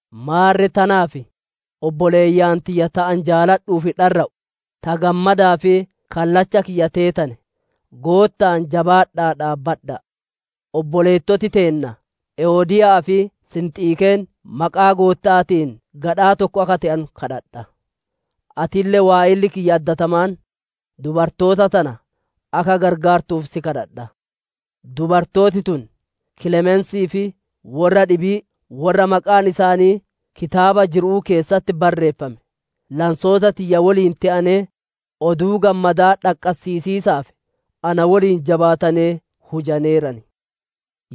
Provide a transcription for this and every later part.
Maarre tanaaf, obboleeyyan tiyya ta ani jaaladhuu fi dharra'u, ta gammadaa fi kallacha kiyya teetane, Gootta'aan jabaadha'aa dhaabbadha'a. Obboleettoti teenna Ewodiya'aa fi Sinxiikeen maqaa Gootta'aatiin gadhaa tokko akka te'anu daadimadha. Atille waa'elli kiyya addatamaan, dubartoota tana akka qarqaartuuf si kadhadha; dubartooti tun, Kilemensii fi worra dhibii worra maqaan isaanii kitaaba jiru'uu keessatti barreeffame, lansoota tiyya woliin te'anee, Oduu Gammadaa dhaqqassiisiisaaf na woliin jabaatanee hujaneeran.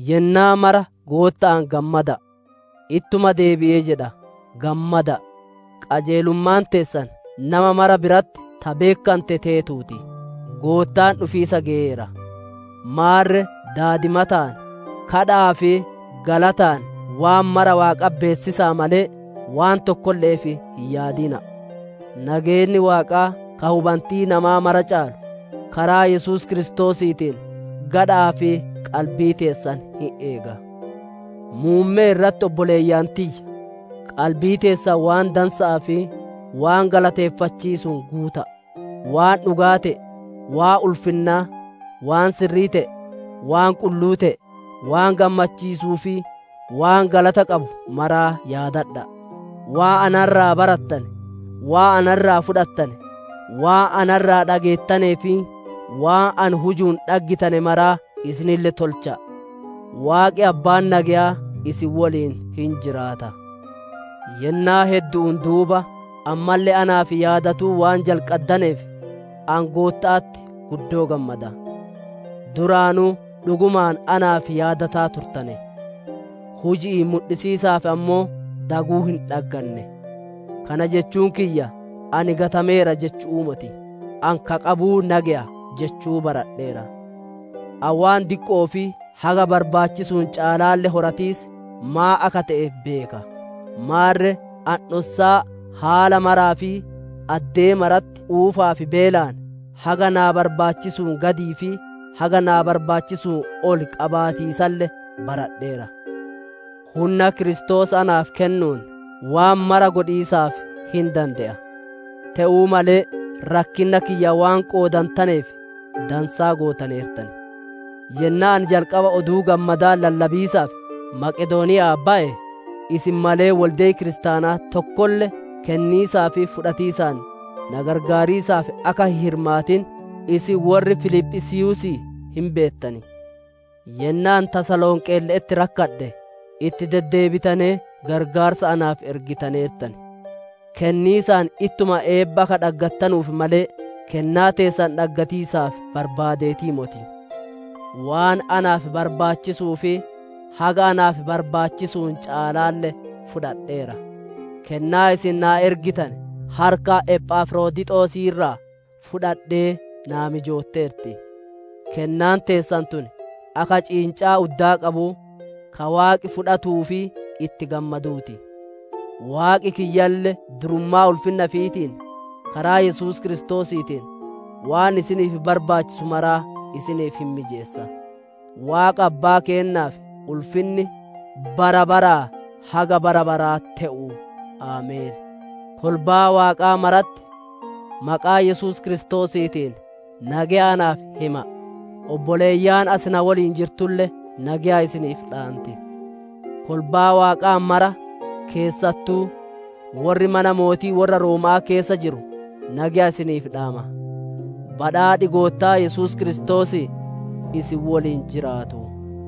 Yennaa mara Gootta'aan gammada'a! Ittuma deebi'ee jedha, gammada'a! Qajeelummaan teessan nama mara biratti ta beekkante teetuu ti; Goottaan dhufiisa geyeera. Maarre daadimataan, gaaffi'ii fi galataan waan mara Waaqatti beessisa'a malee waan tokkolle'eef hin yaadina'a. Nageenni Waaqaa ka hubantii namaa mara caalu, karaa Yesuus Kiristoosiitiin gadha'aa fi qalbii teessan hin eega. Muummee irratti obboleeyyan tiyya! Qalbii teessan waan dansa'aa fi waan galateeffachiisuun guuta'a: waan dhugaa te'e, waan ulfinnaa, waan sirrii te'e, waan qulluu te'e, waan gammachiisuu fi waan galata qabu maraa yaadadha'a! Waan na irraa barattane, waan na irraa fudhattane, waan na irraa dhageettanee fi waan ani hujuun dhaggitane maraa isinille tolcha'a! Waaqi abbaan nageyaa isin woliin hin jiraata. Yennaa heddu'uun duuba ammalle naaf yaadatuu waan jalqaddaneef, ani Gootta'atti guddoo gammada. Duraanuu dhugumaan naaf yaadataa turtane; huji'iin mudhisiisaaf ammoo daguu hin dhagganne. Kana jechuun kiyya ani gatameera jechu'uu moti; ani, «Ka qabuu na geya» jechuu baradheera. Ani waan diqqo'oo fi haga barbaachisuun caalaalle horatiis maan akka te'e beeka; maarre ani dhossaa haala maraa fi addee maratti quufaa fi beelaan, haga naa barbaachisuun gadii fi haga naa barbaachisuun ol qabaatiisalle baradheera. Hunna Kiristoos naaf kennuun waan mara godhiisaaf hin dande'a. Te'uu malee rakkinna kiyya waan qoodantaneef, dansaa gootaneertan. Yennaa ani jalqaba Oduu Gammadaa lallabiisaaf Maqedooniya'aa baye, isin malee wolde'i kiristaanaa tokkolle kenniisaa fi fudhatiisaan na qarqaariisaaf akka hin hirmaatin, isin worri Filiphisiiyuusii hin beettan. Yennaa ani Tasalonqeelle'etti rakkadhe, itti deddeebitanee qarqaarsa naaf ergitaneertan. Kenniisaan ittuma eebba akka dhaggattanuuf malee, kennaa teessan dhaggatiisaaf barbaadeetii moti. Waan naaf barbaachisuu fi haga naaf barbaachisuun caalaalle fudhadheera; kennaa isin naa ergitane harka Ephafrodixosii irraa fudhadhee naa mijootteerti; kennaan teessan tun, akka ciincaa uddaa qabuu, ka Waaqi fudhatuutii fi itti gammaduu ti. Waaqi kiyyalle durummaa ulfinna ifiitiin, karaa Yesuus Kiristoosiitiin, waan isiniif barbaachisu maraa isiniif hin mijeessa. Waaqa Abbaa keennaaf ulfinni bara baraa haga bara baraa te'u! Ameen. Kolbaa Waaqaa maratti maqaa Yesuus Kiristoosiitiin nageya naaf hima'a; obboleeyyan asi na woliin jirtulle nageya isiniif dhaanti. Kolbaa Waaqaa mara, keessattuu worri mana mootii worra Rooma'aa keessa jiru nageya isiniif dhaama. Badhaadhi Goottaa Yesuus Kiristoosii isin woliin jiraatu.